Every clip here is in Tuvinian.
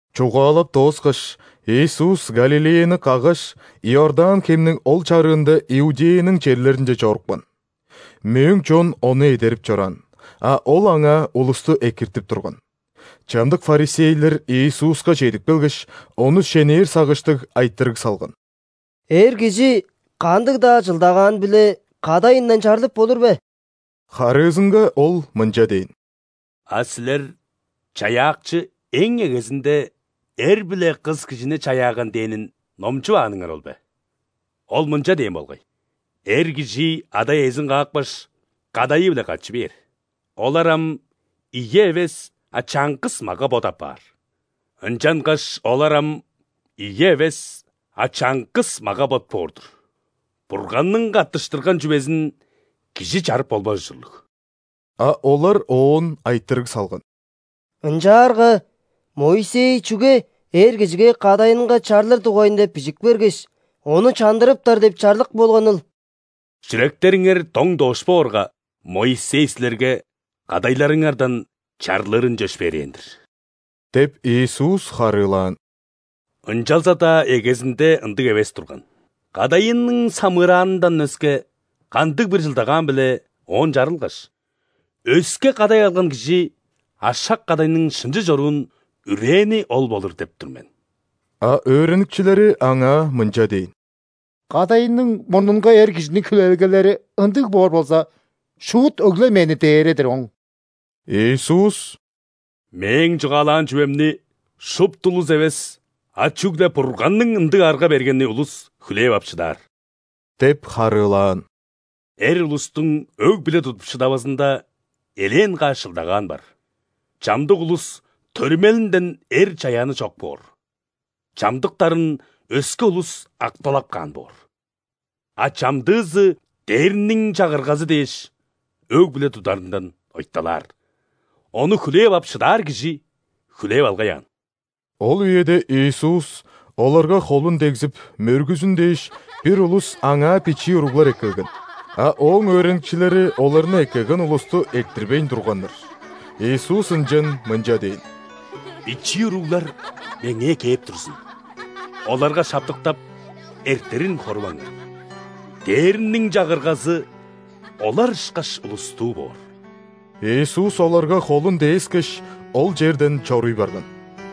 Чугаалап дооскаш, Иисус Галилеяны каггаш, Иордан хемниң ол чарыында Иудеяның черлеринче чорупкан. Мөөң чон Ону эдерип чораан, а Ол аңаа улусту экиртип турган. Чамдык ·фарисейлер Иисуска чедип келгеш, Ону шенээр сагыштыг, айтырыг салган: «Эр кижи кандыг-даа чылдагаан-биле кадайындан чарлып болур бе?» Харыызынга Ол мынча дээн: «А силер Чаяакчы эң эгезинде эр биле кыс кижини чаяаган дээнин номчувааныңар ол бе? Оон мынча дээн болгай: „Эр кижи ада-иезин каапкаш, кадайы-биле катчы бээр, олар ам ийи эвес, а чаңгыс мага-бот апаар“. Ынчангаш олар ам ийи эвес, а чаңгыс мага-бот боор-дур. Бурганның каттыштырган чүвезин кижи чарып болбас ужурлуг». А олар Оон айтырыг салган: «Ынчаарга Моисей чүге эр кижиге кадайынга чарлыр дугайында бижик бергеш, ону чандырыптар деп чарлык болганыл?» «Чүректериңер доң дош боорга, Моисей силерге кадайларыңардан чарлырын чөпшээрээн-дир – деп, Иисус харыылаан. – Ынчалза-даа эгезинде ындыг эвес турган. Кадайының самыыраанындан өске, кандыг-бир чылдагаан-биле оон чарылгаш, өске кадай алган кижи ашак-кадайның шынчы чоруун үрээни ол болур деп тур мен». А өөреникчилери Аңаа мынча дээн: «Кадайының мурнунга эр кижиниң хүлээлгелери ындыг боор болза, шуут өгленмээни дээре-дир оң!» Иисус: «Мээң чугаалаан чүвемни шупту улус эвес, а чүгле Бурганның ындыг арга бергени улус хүлээп ап шыдаар – деп харыылаан. – Эр улустуң өг-бүле тудуп шыдавазында элээн каш чылдагаан бар: чамдык улус төрүмелинден эр чаяаны чок боор, чамдыктарын өске улус акталап каан боор, а чамдыызы Дээрниң Чагыргазы дээш өг-бүле тударындан ойталаар. Ону хүлээп ап шыдаар кижи хүлээп алгай аан!» Ол үеде Иисус оларга холун дегзип, мөргүзүн дээш, бир улус Аңаа бичии уруглар эккелген. А Ооң өөреникчилери оларны эккелген улусту эрттирбейн турганнар. Иисус ынчан мынча дээн: «Бичии уруглар Меңээ кээп турзун, оларга шаптыктап, эртерин хоруваңар! Дээрниң Чагыргазы олар ышкаш улустуу боор». Иисус оларга холун дээскеш, ол черден чоруй барган.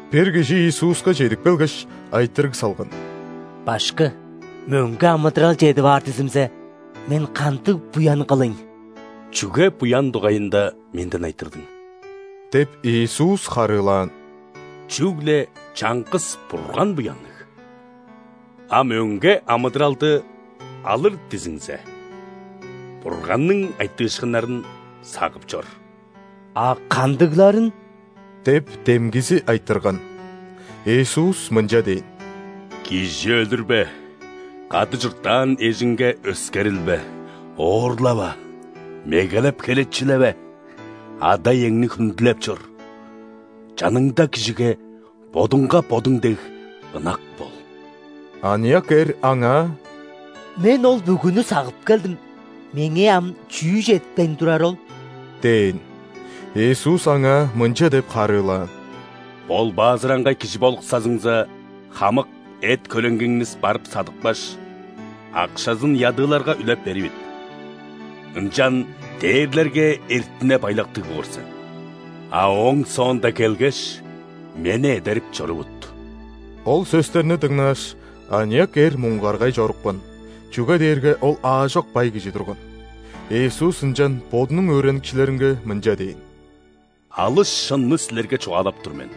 Бир кижи Иисуска чедип келгеш, айтырыг салган: «Башкы! Мөңге амыдырал чедип аар дизимзе, мен кандыг буян кылыйн?» «Чүге буян дугайында Менден айтырдың? – деп, Иисус харыылаан. – Чүгле чаңгыс Бурган буянныг. А мөңге амыдыралды алыр дизиңзе, Бурганның айтыышкыннарын сагып чор». «А кандыгларын?» – деп, демгизи айтырган. Иисус мынча дээн: «Кижи өлүрбе, кады чурттаан эжиңге өскерилбе, оорлава, мегелеп херечилеве, ада-иеңни хүндүлеп чор, чаныңда кижиге бодуңга бодуң дег ынак бол». Аныяк эр Аңаа: «Мен ол бүгүнү сагып келдим. Меңээ ам чүү четпейн турары ол?» – дээн. Иисус аңаа мынча деп харыылаан: «·Болбаазыраңгай кижи болуксазыңза, хамык эт-хөреңгиңни барып садыпкаш, акшазын ядыыларга үлеп беривит, ынчан дээрлерге эртине-байлактыг боор сен. А ооң соонда келгеш, Мени эдерип чорувут». Ол сөстерни дыңнааш, аныяк эр муңгаргай чорупкан, чүге дээрге ол аажок бай кижи турган. Иисус ынчан Бодунуң өөреникчилеринге мынча дээн: «Алыс шынны силерге чугаалап тур мен: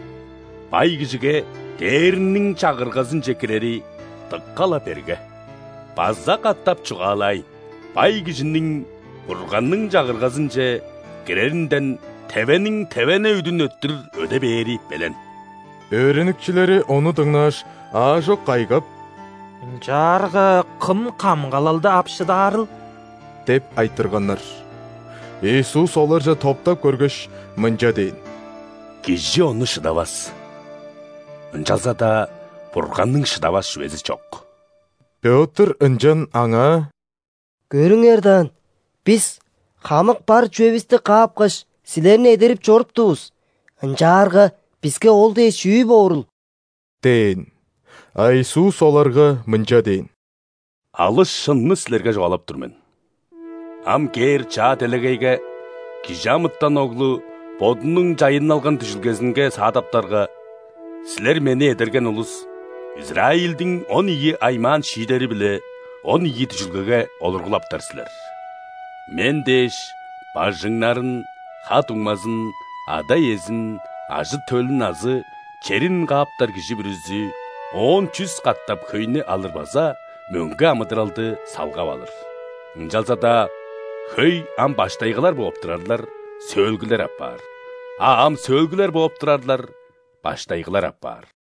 бай кижиге Дээрниң Чагыргазынче кирери дыка-ла берге! База катап чугаалаайн: бай кижиниң Бурганның Чагыргазынче киреринден тевениң тевене үдүн өттүр өде бээри белен». Өөреникчилери ону дыңнааш, аажок кайгап: «Ынчаарга кым камгалалды ап шыдаарыл?» – деп айтырганнар. Иисус оларже топтап көргеш, мынча дээн: «Кижи ону шыдавас, ынчалза-даа Бурганның шыдавас чүвези чок». Пётр ынчан Аңаа: «Көрүңер даан, бис хамык бар чүвевисти каапкаш, Силерни эдерип чоруптувус. Ынчаарга биске ол дээш, чүү боорул?» – дээн. А Иисус оларга мынча дээн: «Алыс шынны силерге чугаалап тур мен: ам кээр чаа делегейге ·Кижи амытан Оглу Бодунуң чайынналган дүжүлгезинге саадаптарга, силер – мени эдерген улус – Израильдиң он ийи аймаан шиидери-биле он ийи дүжүлгеге олургулаптар силер. Мен дээш, бажыңнарын, ха-дуңмазын, ада-иезин, ажы-төлүн азы черин кааптар кижи бүрүзү оон чүс катап хөйнү алыр база мөңге амыдыралды салгап алыр. Ынчалза-даа хөй ам баштайгылар бооп турарлар – сөөлгүлер апаар, а ам сөөлгүлер бооп турарлар – баштайгылар апаар».